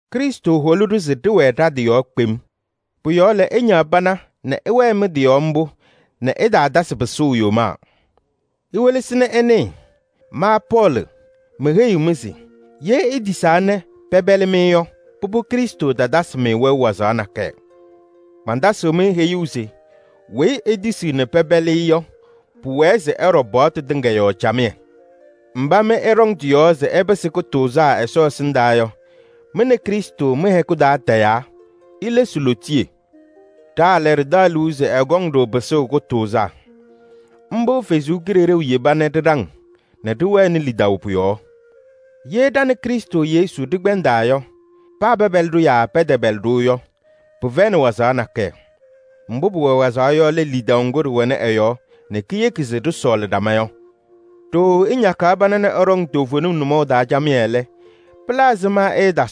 Krɩstʋ holi-ɖʋ se ɖɩwɛɛ ɖa-tɩ yɔɔ kpem. Pʋ-yɔɔ lɛ, ɩñaɣ pana nɛ ɩwɛɛ mɩ-tɩ yɔɔ mbʋ nɛ ɩtaatasɩ pɩsʋʋ yomaa. Iwelesi nɛ ɩnɩɩ, ma Pɔɔlɩ meheyiɣ-mɩ se: ye itisaa nɛ pɛpɛlɩ-mɩ yɔ, pʋbʋ Krɩstʋ tatasɩ-mɩ wɛʋ wazaɣ nakɛyɛ. Mantasɩɣ-mɩ heyuu se: weyi etisiɣ nɛ pɛpɛlɩ-ɩ yɔ, pʋwɛɛ se ɛɖɔ paɣtʋ tɩŋa yɔɔ camɩyɛ. Mba mɩ ɩɖɔŋ tɩ-yɔɔ se ɩpɩsɩ kʋtʋʋzaa Ɛsɔ ɛsɩndaa yɔ, mɩ nɛ Krɩstʋ mɩ-hɛkʋ taa tayaa, ilesi Ɛsɔ lootiye. Ɖa lɛ, ɖɩtaɣ liu se ɛkɔŋ-ɖʋ pɩsʋʋ kʋtʋʋzaa. Mbʋ ɛ-Kalɩzaɣ yeba nɛ ɖɩɖaŋ nɛ ɖɩwɛnɩ lidaʋ pʋ-yɔɔ. Ye ɖa nɛ Krɩstʋ Yesu ɖɩkpɛndaa yɔ, paa pɛpɛlɩ-ɖʋ yaa pɛtɛpɛlɩ-ɖʋ yɔ, pɩfɛyɩnɩ wazaɣ nakɛyɛ: mbʋ pʋwɛ wazaɣ yɔ lɛ lidaʋ ŋgʋ ɖɩwɛnɩ ɛ-yɔɔ nɛ kiyeki se ɖɩsɔɔlɩ ɖama yɔ. Ɖooo ɩñakaɣ pana nɛ ɩɖɔŋ toovenim nʋmɔʋ taa camɩyɛ lɛ, aɖaŋ-mɩ lɛɛlɛɛyɔ?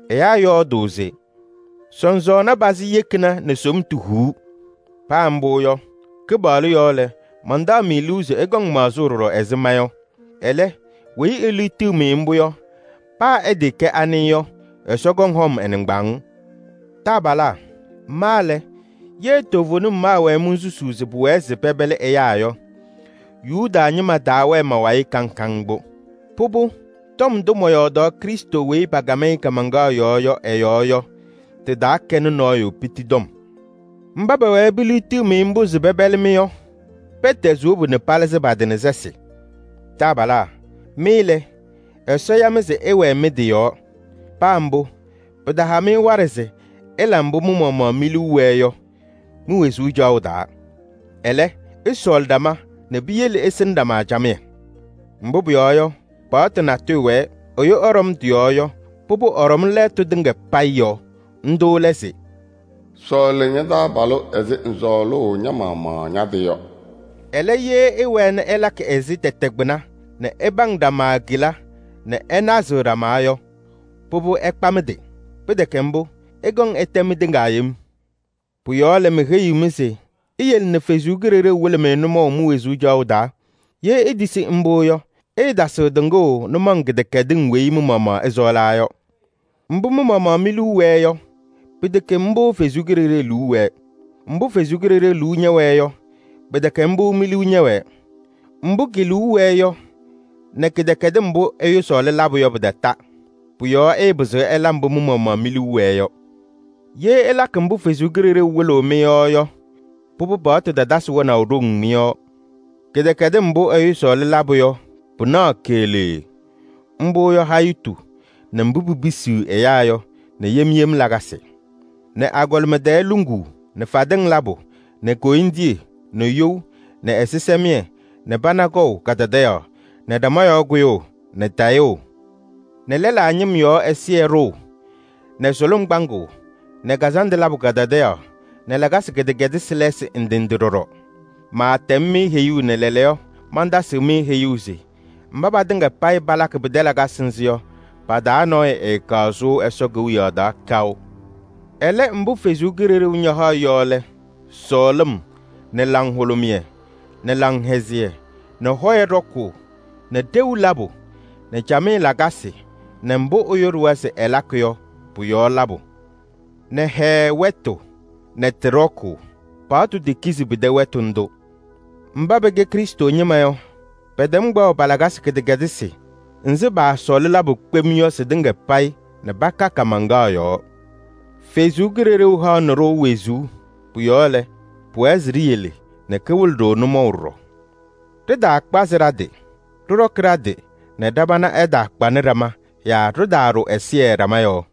Ɛyaa yɔɔdʋʋ se: “Sɔsɔɔna pazɩ yekina nɛ somtu huu.” Paa mbʋ yɔ, Kɩpaɣlʋ yɔɔ lɛ, mantaɣ-mɩ liu se ɩkɔŋ maɣzʋʋ ɖɔɖɔ ɛzɩ ma yɔ. Ɛlɛ, weyi eliɣtiɣ-mɩ mbʋ yɔ, paa ɛtɩɩkɛ anɩ yɔ, Ɛsɔ kɔŋ hɔm ɛ-nɩŋgbaaŋ. Taabalaa! Ma lɛ, ye toovenim maawɛɛ monsusuu se pʋwɛɛ se pɛpɛlɩ ɛyaa yɔ, Yuda ñɩma taawɛɛ ma-wayɩ kaŋ kaŋ mbʋ. Pʋbʋ, tɔm ndʋ mɔyɔɔdaɣ Krɩstʋ weyi pakam-ɩ kaamaŋkaɣ yɔɔ yɔ ɛ-yɔɔ yɔ, tɩtaakɛnɩ nɔɔyʋ mbusu tɔm. Mba pɛwɛɛ peliɣtiɣ-mɩ mbʋ se pɛpɛlɩ-mɩ yɔ, pɛtɛzɩ wobu nɛ palɩzɩ pa-tɩ nɛ sɛsɩ! Taabalaa! Mɩ lɛ, Ɛsɔ ya-mɩ se ɩwɛɛ mɩ-tɩ yɔɔ. Paa mbʋ, pɩtaha-mɩ waɖɛ se ɩla mbʋ mɩ-maɣmaɣ mi-liu wɛɛ yɔ mi-wezuu caɣʋ taa. Ɛlɛ, ɩsɔɔlɩ ɖama nɛ piyele ɩsɩnɩ ɖama camɩyɛ. Mbʋ pʋyɔɔ yɔ, paɣtʋ natʋyʋ wɛɛ, ɛyʋ ɛɖɔm tɩ-yɔɔ yɔ, pʋbʋ, ɛɖɔm lɛɛtʋ tɩŋa payɩ yɔɔ. Ndʋ lɛ se: “Sɔɔlɩ ña-taabalʋ ɛzɩ ŋsɔɔlʋʋ ña-maɣmaɣ ña-tɩ yɔ.” Ɛlɛ, ye ɩwɛɛ nɛ ɩlakɩ ɛzɩ tɛtɛ kpɩna nɛ ɩpaŋ ɖama kela nɛ ɩnazɩɣ ɖama yɔ, pʋbʋ, ɩkpa mɩ-tɩ. Pɩtɛkɛ mbʋ, ɩkɔŋ ɩtɛ mɩtɩŋa yem. Pʋ-yɔɔ lɛ, meheyiɣ-mɩ se: iyele nɛ Ɛsɔ Kalɩzaɣ wɩlɩ-mɩ nʋmɔʋ mi-wezuu caɣʋ taa. Ye itisi mbʋ yɔ, ɩɩtasɩɣ tɩŋʋʋ nʋmɔŋ kɩdɛkɛdɩŋ weyi mɩ-maɣmaɣ ɩsɔɔlaa yɔ. Mbʋ mɩ-maɣmaɣ mi-liu wɛɛ yɔ, pɩtɛkɛ mbʋ Ɛsɔ Kalɩzaɣ liu wɛɛ. Mbʋ Ɛsɔ Kalɩzaɣ liu ñɛwɛɛ yɔ, pɩtɛkɛ mbʋ mi-liu ñɛwɛɛ. Mbʋ ke-liu wɛɛ yɔ nɛ kɩdɛkɛdɩm mbʋ ɛyʋ sɔɔlɩ labʋ yɔ, pɩtata. Pʋ-yɔɔ ɩɩpɩzɩɣ ɩla mbʋ mɩ-maɣmaɣ mi-liu wɛɛ yɔ. Ye ɩlakɩ mbʋ Ɛsɔ Kalɩzaɣ wɩlɩɣ-mɩ yɔ yɔ, pʋbʋ, paɣtʋ tatasɩ wɛnaʋ ɖoŋ mɩ-yɔɔ. Kɩdɛkɛdɩm mbʋ ɛyʋ sɔɔlɩ labʋ yɔ, pɩnaɣ keɣlee. Mbʋ yɔ: hayitu nɛ mbʋ pipisiɣ ɛyaa yɔ nɛ yem yem lakasɩ nɛ agɔlɩma tɛɛ luŋuu nɛ fadɩŋ labʋ nɛ koyindiye nɛ you nɛ ɛzɩsɛmɩyɛ nɛ pana kpaʋ kadadaɣyaɣ nɛ ɖama yɔɔ kʋyʋʋ nɛ tayʋʋ nɛ eyoziye nɛ lɛlaa ñɩm yɔɔ ɛzɩyɛ ɖʋʋ nɛ sʋlʋm kpaŋʋʋ nɛ kazandʋ labʋ kadadaɣyaɣ nɛ lakasɩ kɩdɛkɛdɩsɩ lɛɛsɩ ndɩ ndɩ ɖɔɖɔ. Maatɛm-mɩ heyuu nɛ lɛɛlɛɛyɔ mantasɩɣ-mɩ heyuu se: mba patɩŋa payɩ palakɩ pɩtɛ lakasɩ nzɩ yɔ, pa-taa nɔɔyʋ ɛɛkaɣ sʋʋ Ɛsɔ Kewiyaɣ taa kaʋ. Ɛlɛ, mbʋ Ɛsɔ Kalɩzaɣ ñahaɣ yɔ lɛ: sɔɔlɩm nɛ laŋhʋlʋmɩyɛ nɛ laŋhɛzɩyɛ nɛ hɔyɛ ɖɔkʋʋ nɛ ɖeu labʋ nɛ camɩyɛ lakasɩ nɛ mbʋ ɛyʋ ɖʋwa se ɛlakɩ yɔ pʋ-yɔɔ labʋ nɛ hɛɛɛ wɛtʋ nɛ tɩ ɖɔkʋʋ. Paɣtʋ tekizi pɩtɛ wɛtʋ ndʋ. Mba pɛkɛ Krɩstʋ Yesu ñɩma yɔ, pɛtɛm kpaɣʋ pa-lakasɩ kɩdɛkɛdɩsɩ nzɩ paasɔɔlɩ labʋ kpem yɔ sɩtɩŋa payɩ nɛ paka kaamaŋkaɣ yɔɔ. Ɛsɔ Kalɩzaɣ haɣnɩ-ɖʋ wezuu. Pʋ-yɔɔ lɛ, pʋwɛɛ se ɖiyele nɛ kawɩlɩ-ɖʋ nʋmɔʋ ɖɔɖɔ. Ɖɩtaakpazɩ ɖa-tɩ, ɖɩɖɔkɩ ɖa-tɩ nɛ ɖa-pana ɛtaakpanɩ ɖama yaa ɖɩtaaɖʋ ɛzɩyɛ ɖama yɔɔ.